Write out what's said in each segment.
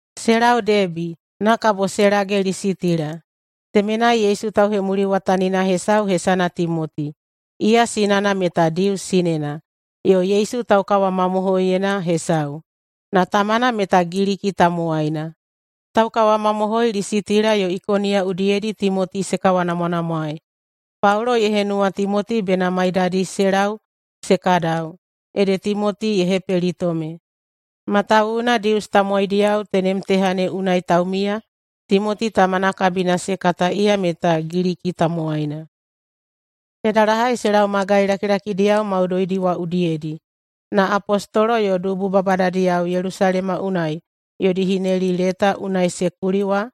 Se lau Debi, na kabo se lage Lisitila. Temenai Yesu tauhemuliwatanina hesau hesana Timoti. Iya sinana meta Dius sinena yo Yesu taukawamamohoiyena hesau, na tamana meta Giliki tamowaina. Taukawamamohoi Lisitila yo Ikoniya udiyedi Timoti se kawanamwanamwaei. Paulo ye henuwa Timoti bena maiyadi se lau se kadau, ede Timoti ye hepelitome, matawuwuna Dius tamowaidiyao tenem teha ne unai taumiya Timoti tamana kabina se kata iya meta Giliki tamowaina. Se dalahai se lau magai lakilakidiyao maudoidi wa udiyedi, na apostolo yo dubu babadadiyao Yelusalema unai yodi hineli leta unai se kuli wa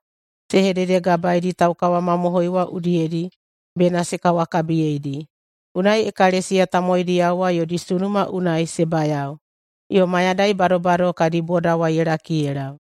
se hededegabaedi taukawamamohoi wa udiyedi bena se kawakabiyeidi. Unai ekalesiya tamowaidiyao wa yodi sunuma unai se bayao, yo mayadai badobado kadi boda wa ye laki ye lau.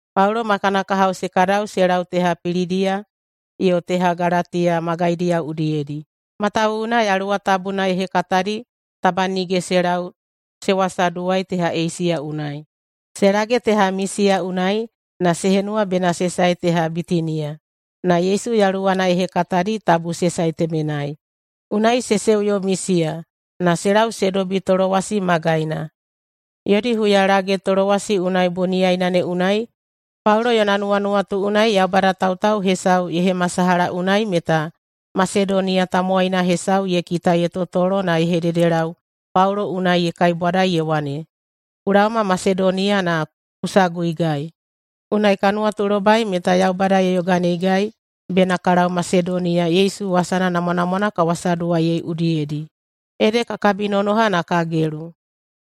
Paulo ma kana kahao se kadau se lau teha Pilidiya yo teha Galatiya magaidiyao udiyedi, matawuwuna Yaluwa Tabuna ye hekatadi taba nige se lau se wasaduwai teha Eisiya unai. Se lage teha Misiya unai na se henuwa bena se sae teha Bitiniya, na Yesu Yaluwana ye hekatadi tabu se sae temenai. Unai se uyo Misiya na se lau se dobi Tolowasi magaina. Yodi huyalage Tolowasi unai boniyaina ne unai Paulo yona nuwanuwatu unai Yaubada tautau hesau ye hemasalaha unai meta Masedoniya tamowaina hesau ye kita ye totolo na ye hededelau Paulo unai ye kaibwada ye wane, “Ku laoma Masedoniya na ku saguigai.” Unai ka nuwatulobai meta Yaubada ye yoganeigai bena ka lau Masedoniya Yesu wasana namwanamwana ka wasaduwaiyei udiyedi. Ede ka kabinonoha na ka gelu.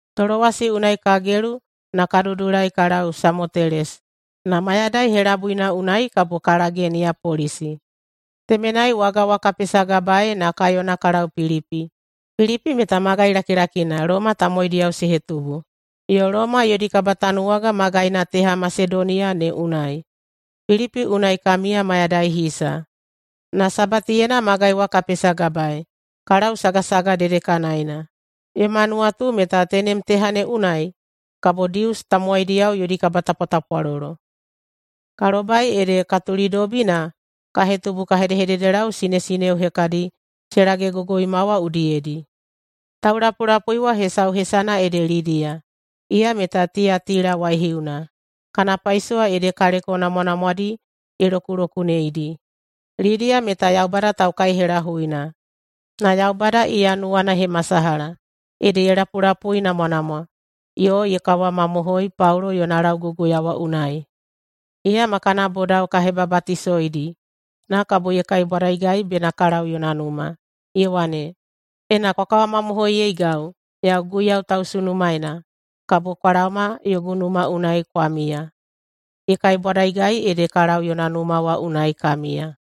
Tolowasi unai ka gelu na ka dudulai ka lau Samotelesi. Na mayadai helabuina unai kabo ka lage Niyapolisi. Temenai waga wa ka pesagabaei na ka yona ka lau Pilipi. Pilipi meta magai lakilakina Loma tamowaidiyao se hetubu, yo Loma yodi kabatanuwaga magaina teha Masedoniya ne unai. Pilipi unai ka miya mayadai hisa, na Sabatiyena magai wa ka pesagabaei ka lau sagasaga dedekanaena. Yoma nuwatu meta tenem teha ne unai kabo Dius tamowaidiyao yodi kabatapwatapwalolo. Ka lobai ede ka tulidobi na ka hetubu ka hedehededelau sinesineo hekadi se lagegogoima wa udiyedi. Taulapulapui wa hesau hesana ede Lidiya, iya meta Tiyatila waihiuna. Kana paisowa ede kaleko namwanamwadi ye lokulokuneidi. Lidiya meta Yaubada taukaihelahuina, na Yaubada iya nuwana ye hemasalaha, ede ye lapulapuinamwanamwa yo ye kawamamohoi Paulo yona lauguguya wa unai. Iya ma kana bodao ka hebabatisoidi, na kabo ye kaibwadaigai bena ka lau yona numa, ye wane, “Ena kwa kawamamohoiyeigau yau Guiyau tausunumaena, kabo kwa laoma yogu numa unai kwa miya.” Ye kaibwadaigai ede ka lau yona numa wa unai ka miya.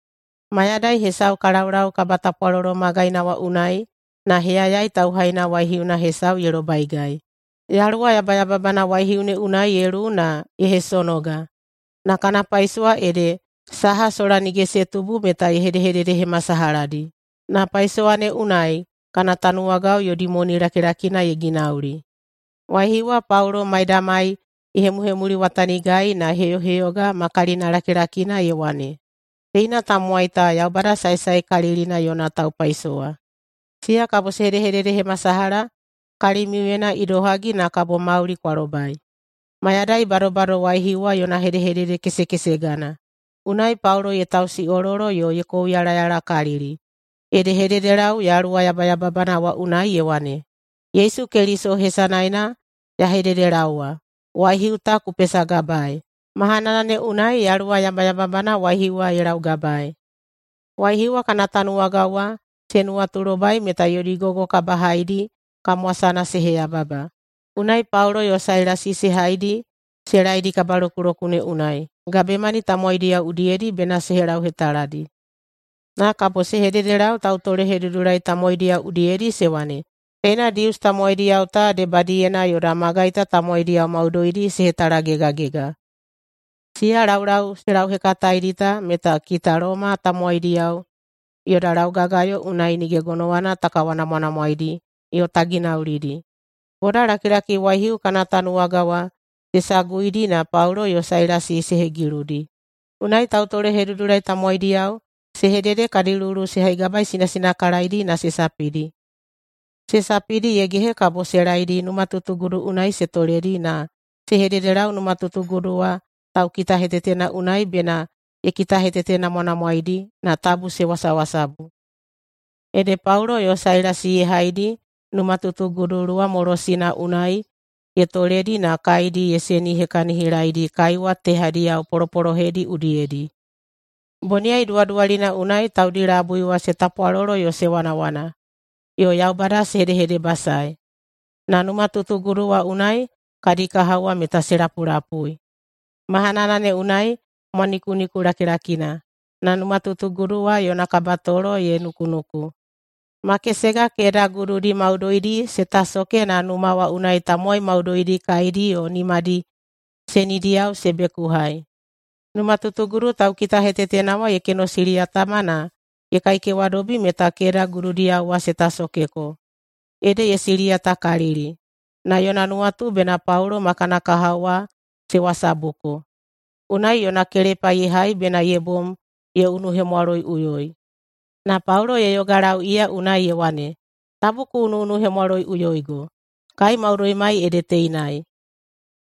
Mayadai hesau ka laulau kabatapwalolo magaina wa unai na heyayai tauhaina waihiuna hesau ye lobaigai. Yaluwa yabayababana waihiu ne unai ye luwu na ye hesonoga, na kana paisowa ede saha sola nige se tubu meta ye hedehededehemasalahadi. Na paisowa ne unai kana tanuwagao yodi moni lakilakina ye ginauli. Waihiu wa Paulo maidamai ye hemuhemuliwatanigai na ye heyoheyoga ma kalinalakilakina ye wane, “Teina tamowai ta Yaubada saesaekalilina yona taupaisowa. Siya kabo se hedehededehemasalaha kalimiuyena idohagi na kabo mauli kwa lobai.” Mayadai badobado waihiu wa yona hedehedede kesekesegana. Unai Paulo ye tausiꞌololo yo ye kouyalayalakalili, ede ye hededelau yaluwa yabayababana wa unai ye wane, “Yesu Keliso hesanaena ya hededelaowa, waihiu ta ku pesagabaei.” Mahanana ne unai yaluwa yabayababana waihiu wa ye laugabaei. Waihiu wa kana tanuwagao wa se nuwatulobai meta yodi gogo kabahaidi kamwasana se heyababa, unai Paulo yo Sailasi se haidi se laedi kabalokulokune unai, gabemani tamowaidiyao udiyedi bena se helauhetaladi. Na kabo se hededelau tautolehedudulai tamowaidiyao udiyedi se wane, “Teina Dius tamowaidiyao ta debadiyena yoda magai ta tamowaidiyao maudoidi se hetalagegagega! Siya laulau se lauhekataedi ta meta kita Loma tamowaidiyao yoda laugagayo unai nige gonowana ta kawanamwanamwaedi yo ta ginaulidi!” Bodalakilaki waihiu kana tanuwagao wa se saguidi na Paulo yo Sailasi se hegiludi, unai tautolehedudulai tamowaidiyao se hedede kadi luwuluwu se haigabaisinasinakalaedi na se sapidi. Se sapidi ye gehe kabo se laedi numatutugudu unai se toledi na se hededelau numatutugudu wa taukitahetetena unai bena ye kitahetetenamwanamwaedi na tabu se wasawasabu. Ede Paulo yo Sailasi ye haidi numatutugudu luwamolosina unai ye toledi na kaedi se koiyahisihekahinidi kaiwa tehadiyao polopolohedi udiyedi. Boniyai duwaduwalina unai taudi labui wa se tapwalolo yo se wanawana yo Yaubada se hedehedebasae, na numatutugudu wa unai kadi kahao wa meta se lapulapui. Mahanana ne unai mwanikuniku lakilakina, na numatutugudu wa yona kabatolo ye nukunuku. Makesega keda gududi maudoidi se tasoke na numa wa unai tamowai maudoidi kaedi yo nimadi senidiyao se bekuhai. Numatutugudu taukitahetetena wa ye kenosiliyatama na ye kaikewadobi meta keda gududiyao wa se tasokeko, ede ye siliyatakalili na yona nuwatu bena Paulo ma kana kahao wa se wasabuko. Unai yona kelepa ye hai bena ye bom ye unuhemwaloiꞌuyoi. Na Paulo ye yogalau iya unai ye wane, “Tabu ku unuꞌunuhemwaloiꞌuyoigo! Kai maudoimai ede teinai!”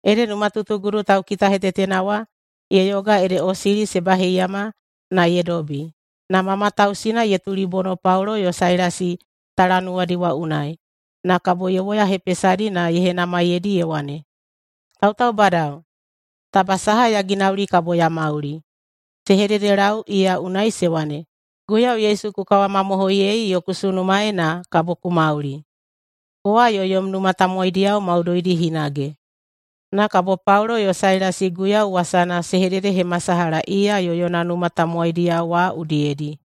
Ede numatutugudu taukitahetetena wa ye yoga ede osili se baheiyama na ye dobi, na ma matausina ye tulibono Paulo yo Sailasi talanuwadi wa unai. Na kabo ye woyahepesadi na ye henamaiyeidi ye wane, “Tautaubadao, taba saha ya ginauli kabo ya mauli?” Se hededelau iya unai se wane, “Guiyau Yesu ku kawamamohoiyei yo ku sunumaei na kabo ku mauli, kowa yo yom numa tamowaidiyao maudoidi hinage.” Na kabo Paulo yo Sailasi Guiyau wasana se hededehemasalaha iya yo yona numa tamowaidiyao wa udiyedi.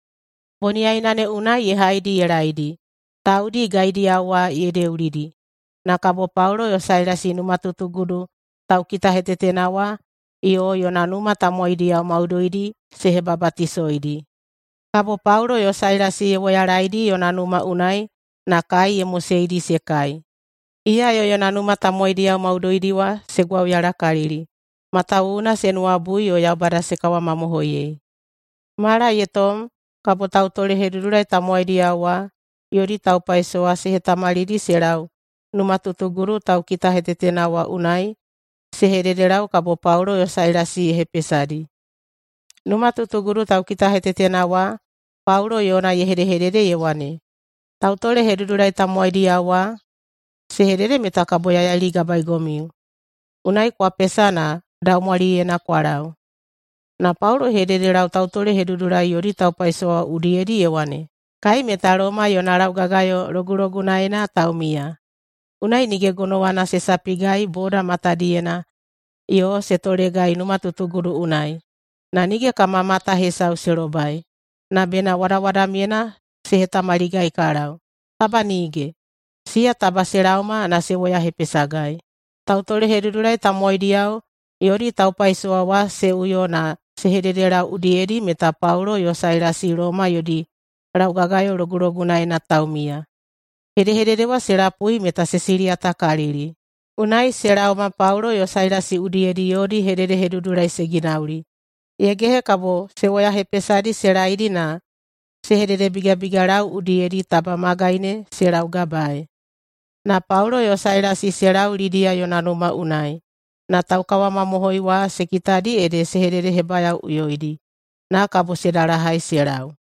Boniyaina ne unai ye haidi ye laedi, taudi gaidiyao wa ye deulidi, na kabo Paulo yo Sailasi numatutugudu taukitahetetena wa yo yona numa tamowaidiyao maudoidi se hebabatisoidi. Kabo Paulo yo Sailasi ye woyalaedi yona numa unai na kai ye moseidi se kai. Iya yo yona numa tamowaidiyao maudoidi wa se gwauyalakalili, matawuwuna se nuwabui yo Yaubada se kawamamohoiyei. Mala ye tom kabo tautolehedudulai tamowaidiyao wa yodi taupaisowa se hetamalidi se lau numatutugudu taukitahetetena wa unai se hededelau kabo Paulo yo Sailasi ye hepesadi. Numatutugudu taukitahetetena wa Paulo yona ye hedehedede ye wane, “Tautolehedudulai tamowaidiyao wa se hedede meta kabo ya yailigabaegomiu. Unai kwa pesa na daumwaliyena kwa lau.” Na Paulo ye hededelau tautolehedudulai yodi taupaisowa wa udiyedi ye wane, “Kai meta Loma yona laugagayo logulogunaena taumiya. Unai nige gonowana se sapigai boda matadiyena yo se tolegai numatutugudu unai, na nige kama mata hesau se lobai. Na bena wadawadamyena se hetamaligai ka lau. Taba nige! Siya taba se laoma na se woyahepesagai!” Tautolehedudulai tamowaidiyao yodi taupaisowa wa se uyo na se hededelau udiyedi meta Paulo yo Sailasi Loma yodi laugagayo logulogunaena taumiya. Hedehedede wa se lapui meta se siliyatakalili. Unai se laoma Paulo yo Sailasi udiyedi yodi hededehedudulai se ginauli. Ye gehe kabo se woyahepesadi se laedi na se hededebigabigalau udiyedi taba magai ne se laugabaei. Na Paulo yo Sailasi se lau Lidiya yona numa unai na taukawamamohoi wa se kitadi ede se hededehebayaoꞌuyoidi, na kabo se dalahai se lau.